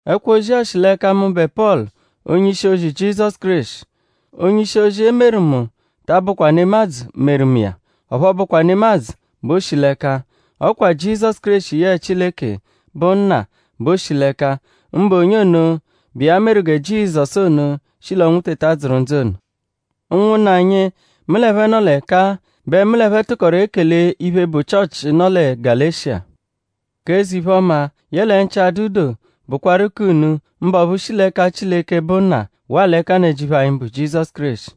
Ẹkwo-ozi-a shi l'ẹka mụbe Pọlu, onye-ishi-ozi Jizọsu Kéreshi. Onye-ishi-ozi, e meru mu ta abụkwa nemadzụ meru mu iya; ọphu ọ bụkwa nemadzụ bẹ o shi l'ẹka. Ọ kwa Jizọsu Kéreshi yẹe Chileke, bụ Nna bẹ o shi l'ẹka, mbụ onye ono bụ iya meru gẹ Jizọsu ono shi l'ọnwu teta dzụru ndzụ ono. Ụnwunna anyi, mu l'ẹphe nọ l'ẹka-a bẹ mu l'ẹphe tụkoru ekele iphe, bụ Chịochi, nọ lẹ Galeshiya. G'eze-iphe-ọma; yẹle nchị-adụ-doo bụkwaru k'unu; mbụ ọphu shi l'ẹka Chileke, bụ Nna; waa l'ẹka Nnajịuphu anyi, bụ Jizọsu Kéreshi,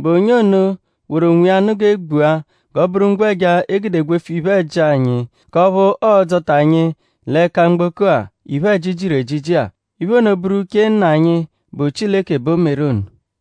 bụ onye ono woru onwiya nụ g'e gbua g'ọ bụru ngwẹja, e gude gwefu iphe-ẹji anyi; k'ọphu ọodzota anyi l'ẹka mgboko-a, iphe-ẹji jiru ejiji-a. Iphe ono bụru uche Nna anyi, bụ Chileke bẹ o meru ono.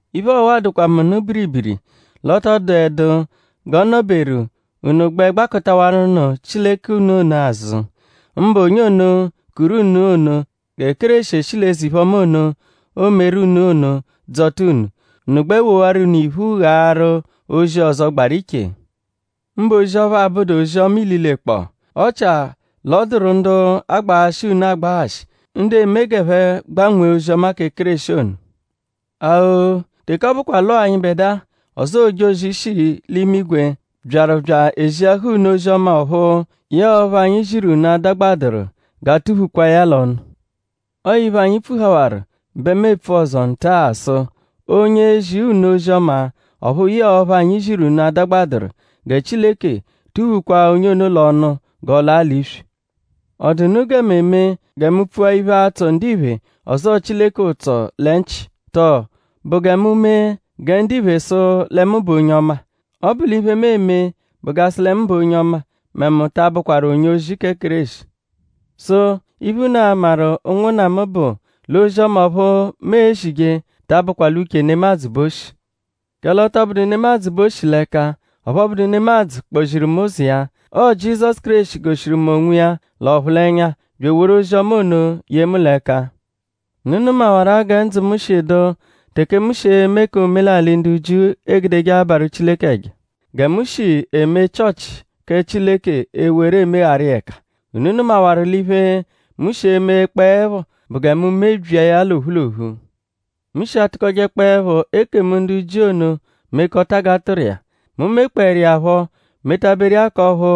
Iphe ọwa-a dụkwa mu nụ biribiri l'ọ tọ dụedu g'ọ nọberu unu gbẹ agbakụtawaru nụ Chileke unu ono azụ; mbụ onye ono kuru unu ono gẹ Kéreshi eshi l'eze-iphe-ọma ono, o meru unu ono dzọta unu; unu gbẹ wowarụnu iphu ghaaru ozi ọzo gbaru iche; mbụ ozi ọphu abụdu ozi-ọma ililekpọo; ọchia l'ọ dụru ndu agbaghashị unu agbaghashị; ndu eme g'ẹphe gbanwee ozi-ọma kẹ Kéreshi ono. A-o; teke ọ bụkwa l'ọo anyịbedua; ọzoo ojozi, shi l'imigwe byaru bya eziahaa unu ozi-ọma ọphu yẹe ọphu anyi ziru unu adagbadụru; g'a tụ-phukwaa ya l'ọnu. Ọo iphe, anyi pfuhawaru bẹ mu epfu ọzo nta-a sụ: onye ezi unu ozi-ọma ọphu yẹe ọphu anyi ziru unu adagbadụru; gẹ Chileke tụ-phukwaa onye ono l'ọnu g'ọ laa l'iswi. ?Ọ dụ unu gẹ mu eme gẹ mu pfua iphe, a-tsọ ndiphe ọzoo Chileke ụtso lẹ nchị? Tọo?Bụ gẹ mu mee gẹ ndiphe sụ lẹ mu bụ onye ọma? Ọ bụ l'iphe, mu eme bụ g'a sụ lẹ mu bụ onye ọma mẹ mu ta abụkwaru onye-ozi kẹ Kéreshi. Sụ: iphe, unu a-maru; ụnwunna mu; bụ l'ozi-ọma ọphu mu ezije ta abụkwa l'uche nemadzụ bẹ o shi. Kẹle ọ tọ bụdu nemadzụ bẹ o shi l'ẹka; ọphu ọ bụdu nemadzụ kpọ-ziru mu ụzo iya. Ọo Jizọsu Kéreshi goshiru mu onwiya l'ọphulenya bya eworu ozi-ọma ono ye mu l'ẹka. Unu nụmawaru-a gẹ ndzụ mu shi dụ teke mu shi eme k'omelalị, ndu Jiu egudeje abarụ Chileke ẹja; gẹ mu shi eme Chịochi kẹ Chileke ewere emegharu iya ẹka. Unu nụmawaru l'iphe, mu shi emekpọepho gẹ mu mee bụ gẹ mu mebyia ya l'ophu l'ophu. Mu shi atụkojekpoepho ekemu ndu Jiu ono mekọta g'a tụru iya. Mu mekpọeru iya phọ metaberu iya k'ọphu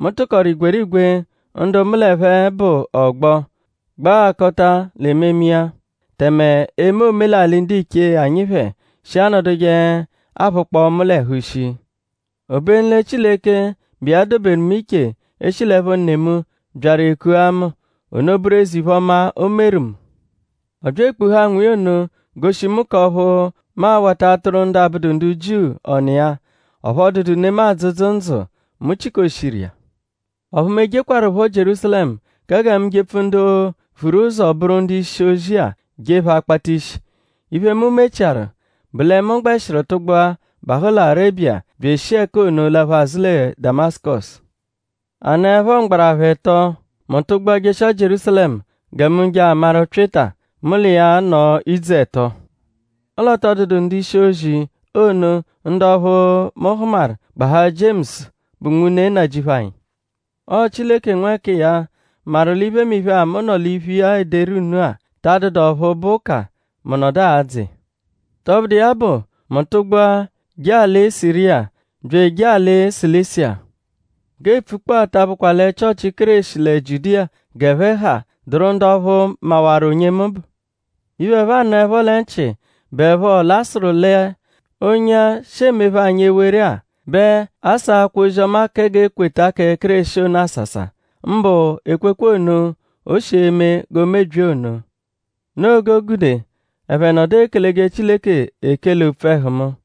mu tụkoru igwerigwe ndu mu l'ẹphe bụ ọgbo gbaghakọta l'ememe iya; tẹme eme omelalị ndiche anyi phẹ shi anọduje aphụkpoo mu l'ẹhu shii. Obenu lẹ Chileke, bụ iya doberu mu iche eshi l'ẹpho ne mu; byaru ekua mu; ono bụru eze-iphe-ọma, o meru mu. Ọ bya ekpuhaa nwa iya ono goshi mu k'ọphu mu awata atụru ndu abụdu ndu Jiu ọnu iya. Ọphu ọ dụdu nemadzụ, dzụ ndzụ mu chịkoshiru iya. Ọphu mu ejekwaruphọ Jierúsalẹmu kẹ gẹ mu jepfu ndu vuru ụzo bụru ndu-ishi-ozi-a je phẹ akpata ishi. Iphe, mu mechiaru bụ lẹ mu gbẹshiru tụgbua bahụ lẹ Arebiya bya eshi ẹka ono laphu azụ lẹ Damasụkosu. A nọepho mgbarapha ẹto; mu tụgbua jeshia Jierúsalẹmu gẹ mu je amaru Pyịta. Mu l'iya nọo idzu ẹto. Ọle ọ tọ dụdu ndu-ishi-ozi ono ndu ọphuu, mu hụmaru gbahaa Jiemusu, bụ nwune Nnajịuphu anyi. Ọo Chileke nwẹkiya maru l'iphemiphe-a, mu nọ l'iphu iya ederu unu-a ta adụdu ọphu bụ ụka, mu nọdu adzụ iya. Tọbudu iya bụ; mu tụgbua jee alị Siriya bya ejee alị Silisiya. G'e pfukpọ-a ta abụkwa lẹ Chịochi Kéreshi lẹ Jiudiya g'ẹphe ha dụru ndu ọphu mawaru onye mu bụ. Iphe, ẹphe anụepho lẹ nchị bụepho l'a sụru lẹ “onye-a, shi emephe anyi ewere-a bẹ asaakwa ozi-ọma kẹ g'e kweta kẹ Kéreshi ono asasa. Mbụ ekwekwe ono, o shi eme g'o mebyia emebyi ono.” Noo g'o gude ẹphe nọdu ekeleje Chileke ekele opfu ẹhu mu.